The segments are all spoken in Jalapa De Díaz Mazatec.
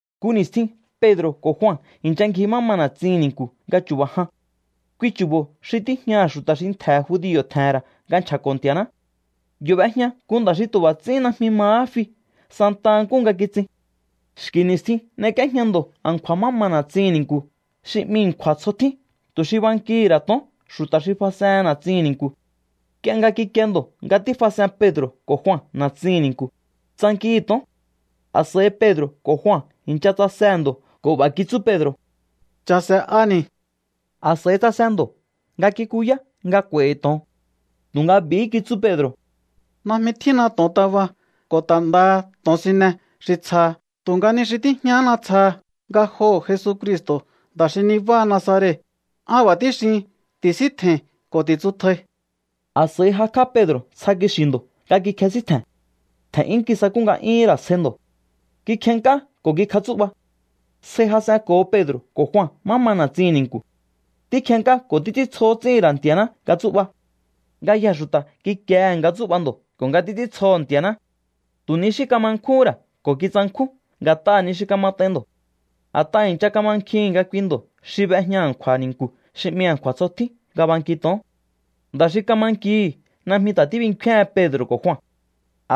Nku ni̱stjin Pedro̱ ko̱ Jua i̱ncha ngji má ma na̱tsihi̱n ni̱nku̱ nga chu̱ba̱ jan. Kui chu̱bo̱ xi tíjñaha̱ xu̱ta̱ xi ntje̱ judio̱ tje̱he̱n ra̱ nga nchja̱ko̱ Nti̱a̱ná. Yo̱ b'ejña nku nda̱ xi tu̱ b'a̱ ts'ín najmi mahá fi santa nkúhu nga kitsin. Xki̱ ni̱stjin n'ek'íéjña ndo̱ a̱nkju̱a̱ má ma na̱tsihi̱n ni̱nku̱ xi 'mi A̱nkju̱a̱ Tsjo Tjín tu̱ xi bankihi̱ ra̱ to̱on xu̱ta̱ xi fas'ehen na̱tsihi̱n ni̱nku̱. Nk'ie nga kikie ndo̱ nga tífas'en Pedro̱ ko̱ Jua na̱tsihi̱n ni̱nku̱, tsankihi̱ to̱on. A̱s'a̱i Pedro̱ ko̱ Jua i̱ncha tsasehe̱ ndo̱ ko̱ b'a̱ kitsú Pedro̱: —Cha̱se̱'ani̱. A̱s'a̱i tsase ndo̱ nga kikuyá nga k'u̱a̱i̱hi̱ to̱on. Tu̱nga b'i̱hí kitsú Pedro̱: —Najmi tjínna to̱ontaba ko̱ ta̱ ndaha to̱onsine xi tsjaha tu̱nga ni xi tíjñahána tsjaha. Ngajoho̱ Jesucristo̱, nda̱ xi nibáha Nazaret, an b'a̱ tíxihin: Ti̱síntje̱i̱n ko̱ ti̱tsutjai. A̱s'a̱i jakj'á Pedro̱ ntsja kixi̱ ndo̱ nga kikjesíntje̱n. Tje̱n'yún kisakú nga'yúhún ra̱ sjai ndo̱. Kikjennk'á ko̱ kikjatsú'ba. Sjai jas'enko̱ho Pedro̱ ko̱ Jua má ma na̱tsihi̱n ni̱nku̱. Tíkjennk'á ko̱ títs'íntsjohó ts'íhi̱n ra̱ Nti̱a̱ná nga tsú'ba. Ngayjee̱ xu̱ta̱ kikiehe̱ nga tsú'ba ndo̱ ko̱ nga títs'íntsjoho̱ Nti̱a̱ná. Tu̱ ni xí kama nkjúhún ra̱ ko̱ kitsankjún nga̱t'aha̱ ni xi kamat'ain ndo̱. A̱t'aha̱ i̱ncha kamankjihi̱n nga kui ndo̱ xi b'ejña a̱nkju̱a̱ ni̱nku̱ xi 'mi A̱nkju̱a̱ Tsjo Tjín nga banki to̱on. Nda̱ xi kama nkihi̱ najmi ta̱ tíbinkféhen Pedro̱ ko̱ Jua.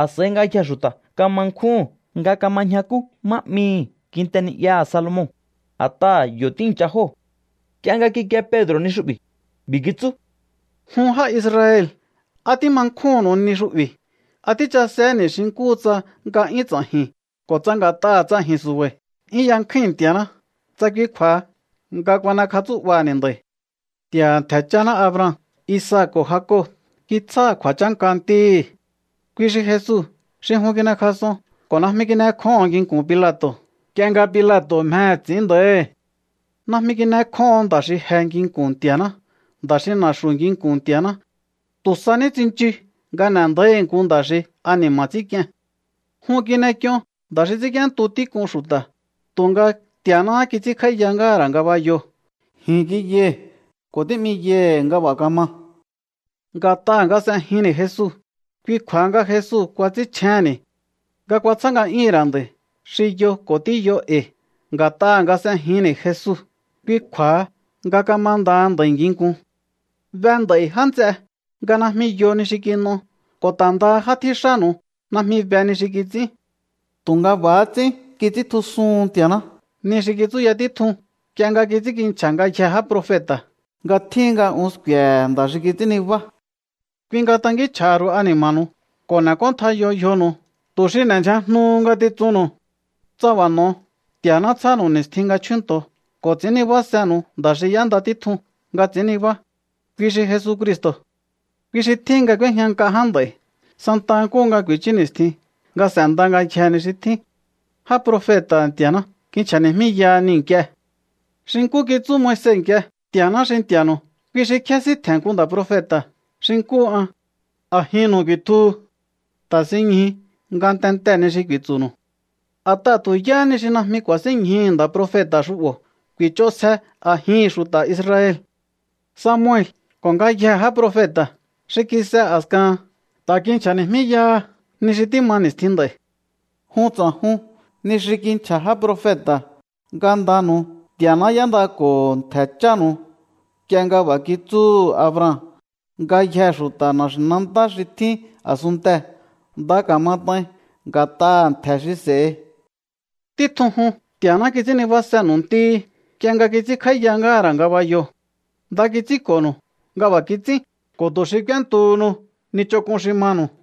A̱s'a̱i ngayjee̱ xu̱ta̱ kama nkjúhun nga kama ñjakú má 'mihi̱ Kinte Ni'yaha̱ Salomon, a̱t'aha̱ yo̱ tíi̱ncha jóo̱. Nk'ie nga kikie Pedro̱ ni xu'bi̱, b'i̱ kitsú: —Jun já Israel, ¿á tíma nkjúhu̱nnu̱u ni xu'bi̱? ¿Á tíchasehe̱ni̱ xi nkúhu tsa nga'yún ts'a̱ji̱n ko̱ tsa nga̱t'aha̱ tsa ji̱n su̱ba̱i̱ 'yún yankjúi̱n Nti̱a̱ná, tsa kui kju̱a̱ha nga kuan'ekjatsú'baha̱ni̱ nda̱i̱? Nti̱a̱ha̱ ntje̱ cháná Abraham, Isaac ko̱ Jacob kitsjáha̱ kju̱a̱chánka Ntíhi̱. Kui xi Jesu xi jun kin'ekjas'on ko̱ najmi kin'ekjóho̱n nginku̱n Pilato̱ nk'ie nga Pilato̱ mjehe̱ ts'i̱ín nda̱íhi̱. Najmi kin'ekjóho̱on nda̱ xi je nginku̱n Nti̱a̱ná, nda̱ xi na̱xu̱ nginku̱n Nti̱a̱ná. Tu̱ sa ní tsinchu nga n'e̱ nda̱íhi̱ nku nda̱ xi ani̱ma̱ ts'ínk'ien. Jun kin'ek'ion nda̱ xi ts'ínk'íéntu tík'un xu̱ta̱, tu̱nga Nti̱a̱náhá kits'ínkj'áíya ngáha̱ ra̱ ngabayoo̱. Ji̱n kiyai̱ ko̱ tí'miyai̱hi̱ nga b'a̱ kama. Nga̱t'aha̱ nga s'ejinni̱ Jesu, kui kju̱a̱ha nga Jesu kuats'ínchjénni̱ nga kuatsjá nga'yúhu̱n ra̱ nda̱i̱ xi yo ko̱ tíyo e̱i̱. Nga̱t'aha̱ nga s'ejinni̱ Jesu, kui kju̱a̱ha nga kamandaha nda̱i̱ nginkun. ’Be nd'a̱i̱, já nts'e, nga najmi yo ni xi kin'o ko̱ ta̱ ndaha já tjíxánu̱u najmi be ni xi kits'ín. Tu̱nga b'a̱há ts'ín kits'íntjusuhun Nti̱a̱ná ni xi kitsúya títjun nk'ie nga kits'ínkinchja̱ ngayjee̱ já profeta̱, nga tjíhin nga un sku̱e̱he̱ nda̱ xi kits'ín nibá. Kui nga tankínchj'a̱ha̱ ru̱u ani̱ma̱nu̱u ko̱ n'e̱k'óntjaiyo yjonu̱u tu̱ xi n'e̱ndyjajnuhu ngatitsunnu̱u. Tsa b'a̱ n'o̱o, Nti̱a̱ná tsjánu̱u ni̱stjin nga chjúnto̱o ko̱ ts'i̱ín nibásenu̱u nda̱ xi y'énda títjun nga ts'i̱ín nibá. Kui xi Jesucristo̱. Kui xi tjíhin nga k'úéjña nk'a ján nd'a̱i̱ santaha nkúhu nga ku̱i̱chú ni̱stjin nga s'e̱nda ngáha ngayjee̱ ni xi tjín. Já profeta̱ha̱ Nti̱a̱ná kinchja̱ni̱jmíyaha niu̱ nk'ie. ’Xi nkú kitsú Moise nk'ie: “Nti̱a̱ná xi Nti̱a̱nu̱u, kui xi kjésíntje̱n nku nda̱ profeta̱ xi nkúhu an. A̱jinnu̱u ku̱i̱tjuhu. Ta̱sinñju ngatentee̱ ni xi ku̱i̱tsu̱nu̱u. A̱t'aha̱ tu̱ yáha ni xi najmi ku̱a̱sínñjuhu̱ nda̱ profeta̱ xu'bo̱ ku̱i̱ch'onsje a̱jihi̱n xu̱ta̱ Israel.” Samuel ko̱ ngayjee̱ já profeta̱ xi kis'e a̱skahan ta̱ kinchja̱ni̱jmíyaha ni xi tíma ni̱stjin nd'a̱i̱. ’Jun ts'a̱jun ni xi kinchja̱ já profeta̱. Ngandanu̱u Nti̱a̱ná y'éndako̱ho ntje̱ chánu̱u nk'ie nga b'a̱ kitsúhu̱ Abraham: “Ngayjee̱ xu̱ta̱ na̱xi̱nantá xi tjín a̱sunntee̱ nda ka̱mat'ain nga̱t'aha̱ ntje̱ xi s'e̱hi.” Títjun jun Nti̱a̱ná kits'ín nibásenu̱u Ntíhi̱ nk'ie nga kits'ínkj'áíya ngáha̱ ra̱ ngabayoo̱. Nda kits'ínko̱nu̱u nga b'a̱ kits'ín ko̱ tu̱ xi k'úéntuhunu ni ch'onk'un xi manu̱u.